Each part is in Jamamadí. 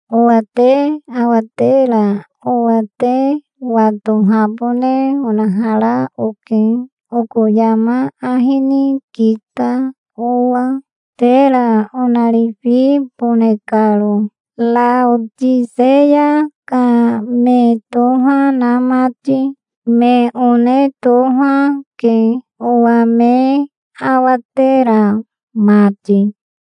Owa te awatera owa te watohabone onahara oke, oko yama ahi ni kita owa, tera onarifibone karo, Raotiseya ka me toha na mati. Me one toha, ke owa me awatera mati.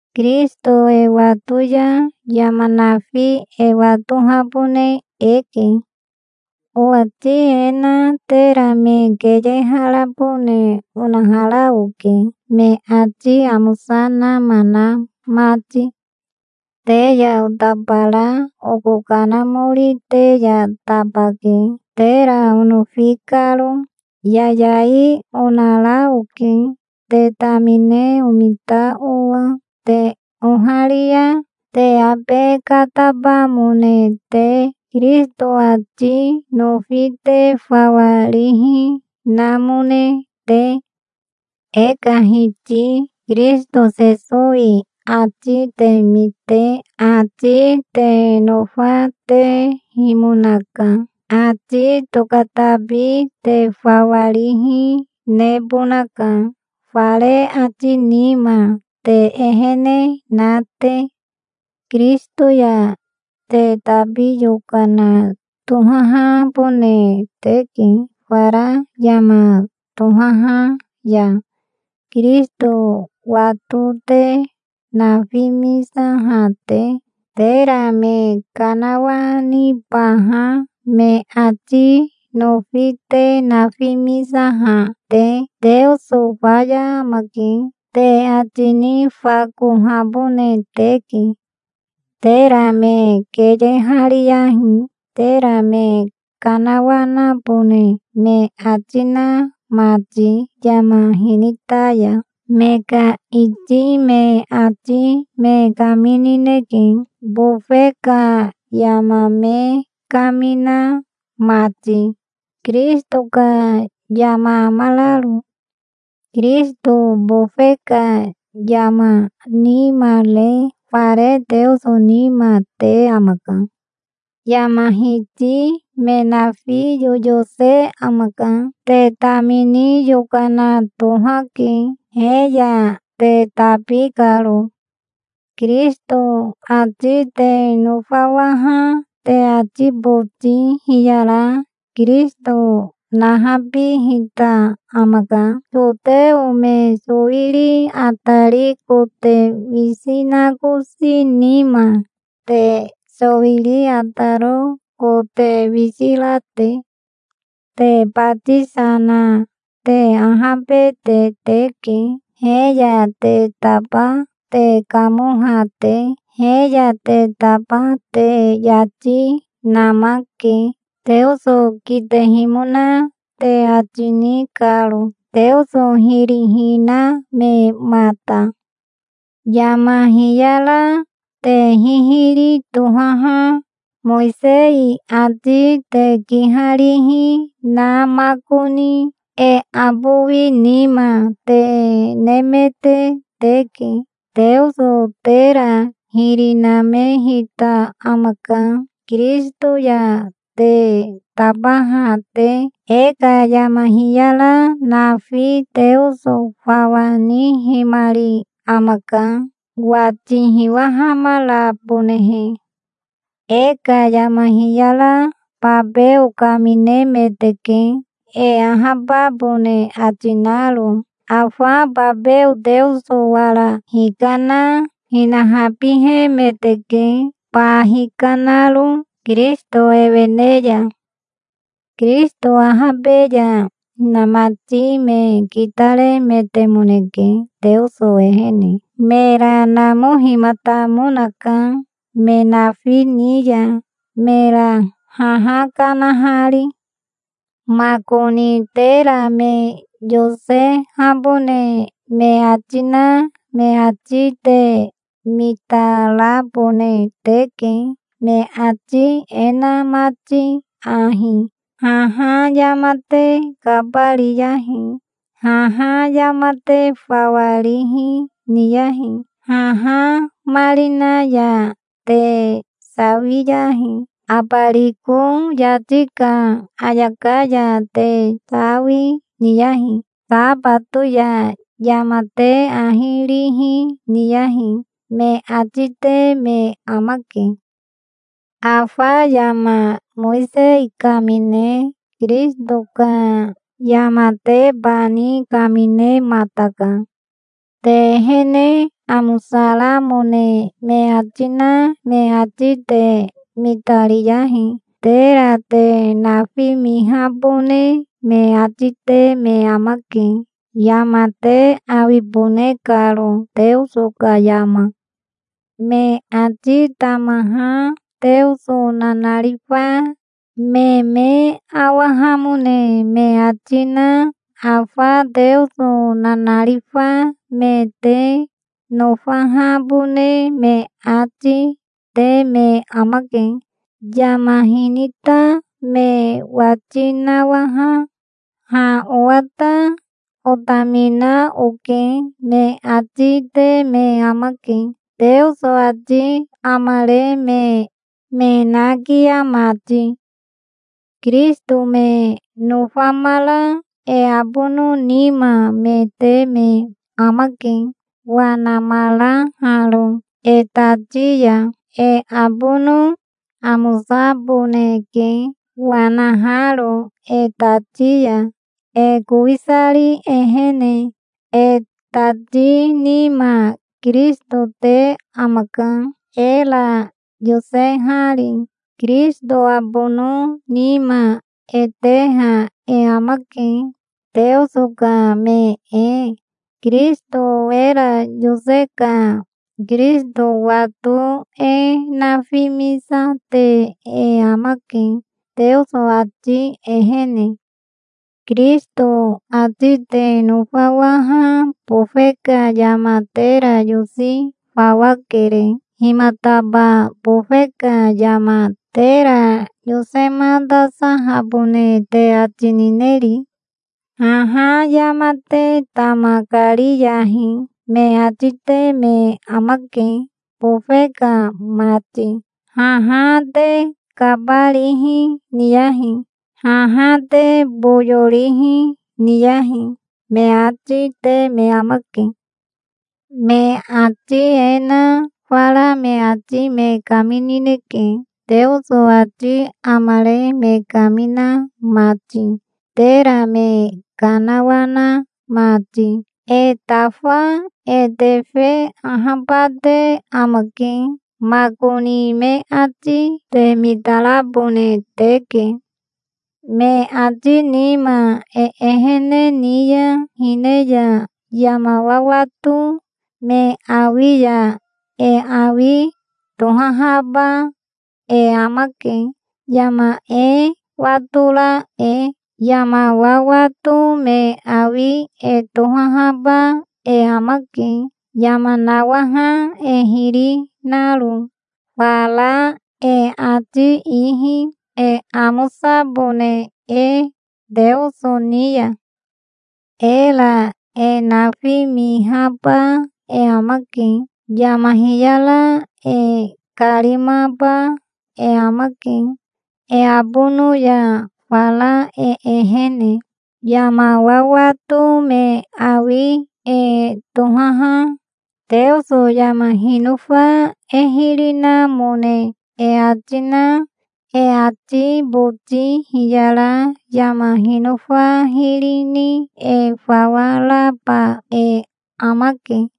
Kirisito e wato ya yama nafi e watohabone eke. Owati e na tera me keyeharabone onahara oke, me ati amosa nama na mati. Te ya otabara oko kanamori te ya tabake, tera onofi karo. Yayai onara oke, te tamine omita owa, te oharia te abe katabamone te, Kirisito ati nofi te fawa rihi namone te. E ka Hiti Kirisito Sesowi ati te mite ati te nofatehimonaka. Ati tokatabi te fawa rihi nebonaka, fare ati nima te ehene na te. Kirisito ya te tabi yokana tohahabone teke, fara yama tohaha ya, Kirisito wato te nafimisaha te, tera me kanawanibaha me ati nofi te nafimisaha te. "Teoso faya amake", te ati nifakohabone teke. Tera me keyehariyahi, tera me kanawanabone me ati na mati, yama hinita ya. Me ka iti me ati me kaminineke, bofe ka yama me kamina mati, Kirisito ka yama amararo. Kirisito bofe ka yama nima re fare Teoso nima te amaka. Yama hiti me nafi yoyose amaka. Te tamini yokana tohake, he ya te tabi karo. Kirisito ati te nofawaha te ati boti hiyara Kirisito nahabihita amaka, soteo me sowiri atari kote wisi nakosi nima, te sowiri ataro kote wisi ra te. Te batisa na te ahabete teke, he ya te taba te kamoha te. He ya te taba te yati namake, Teoso kitehimona te ati ni karo, Teoso hiri hinamemata. Yama hiyara te hihiri tohaha Mowisei ati te kiharihi na makoni e abowi nima te nemete teke. Teoso tera hiri namehita amaka, Kirisito ya te tabaha te. E ka yama hiyara nafi Teoso fawa nihimari amaka, wati hiwahamarabonehe. E ka yama hiyara babeo kaminemeteke, e ahababone ati naro. Afa babeo Teoso wara hikana hinahabihemeteke, ba hikanaro Kirisito ewene ya. Kirisito ahabe ya hinamati me kitaremetemoneke, Teoso ehene. Mera namohimatamonaka me nafi ni ya, mera haha kanahari. Makoni tera me yosehabone me ati na me ati te mitarabone teke, me ati e na mati ahi: "Haha yama te kabariyahi. Haha yama te fawa rihi niyahi. Haha marina ya te sawiyahi. Abariko yati ka ayaka ya te sawi niyahi. Sabato ya yama te ahi rihi niyahi", me ati te me amake. Afa yama Mowisei kamine Kirisito ka yamatebani kaminemataka. Te ehene amosaramone me ati na me ati te mitariyahi. Tera te nafimihabone me ati te me amake, yama te awibone karo, Teoso ka yama. Me ati tamaha Teoso nanarifa me me awahamone me ati na afa Teoso nanarifa me te nofahabone me ati te me amake. Yama hinita me wati nawaha, "Ha owa ta otamina oke", me ati te me amake, Teoso ati amare me nakia mati. Kirisito me nofamara e abono nima me te me amake, wanamaraharo e tati ya. E abono amosaboneke, wanaharo e tati ya, e kowisari ehene. E tati nima Kirisito te amaka, era yosehari. Kirisito abono nima e teha e amake, Teoso ka me e. Kirisito era yose ka Kirisito wato e nafimisate e amake, Teoso ati ehene. Kirisito ati te nofawaha bofe ka yama tera yosi fawa kere. Himataba bofe ka yama tera yosematasahabone te ati nineri? "Haha yama te tama kariyahi", me ati te me amake, bofe ka mati. "Haha te kabarihi niyahi. Haha te boyo rihi niyahi", me ati te me amake. Me ati e na fara me ati me kaminineke, Teoso ati amare me kamina mati, tera me kanawana mati. E tafa e tefe ahabate amake. Makoni me ati te mitarabone teke. Me ati nima e ehene ni ya hine ya yama wawato me awi ya e awi tohahaba e amake, yama e watora e. Yama wawato me awi e tohahaba e amake, yama nawaha e hiri naro fara e ati ihi, e amosabone e Teoso ni ya. Era e nafimihaba e amake. Yama hiyara e karimaba e amake e abono ya fara e ehene. Yama wawato me awi e tohaha Teoso yama hinofa e hiri namone e ati na e ati boti hiyara yama hinofa hiri ni e fawa raba e amake.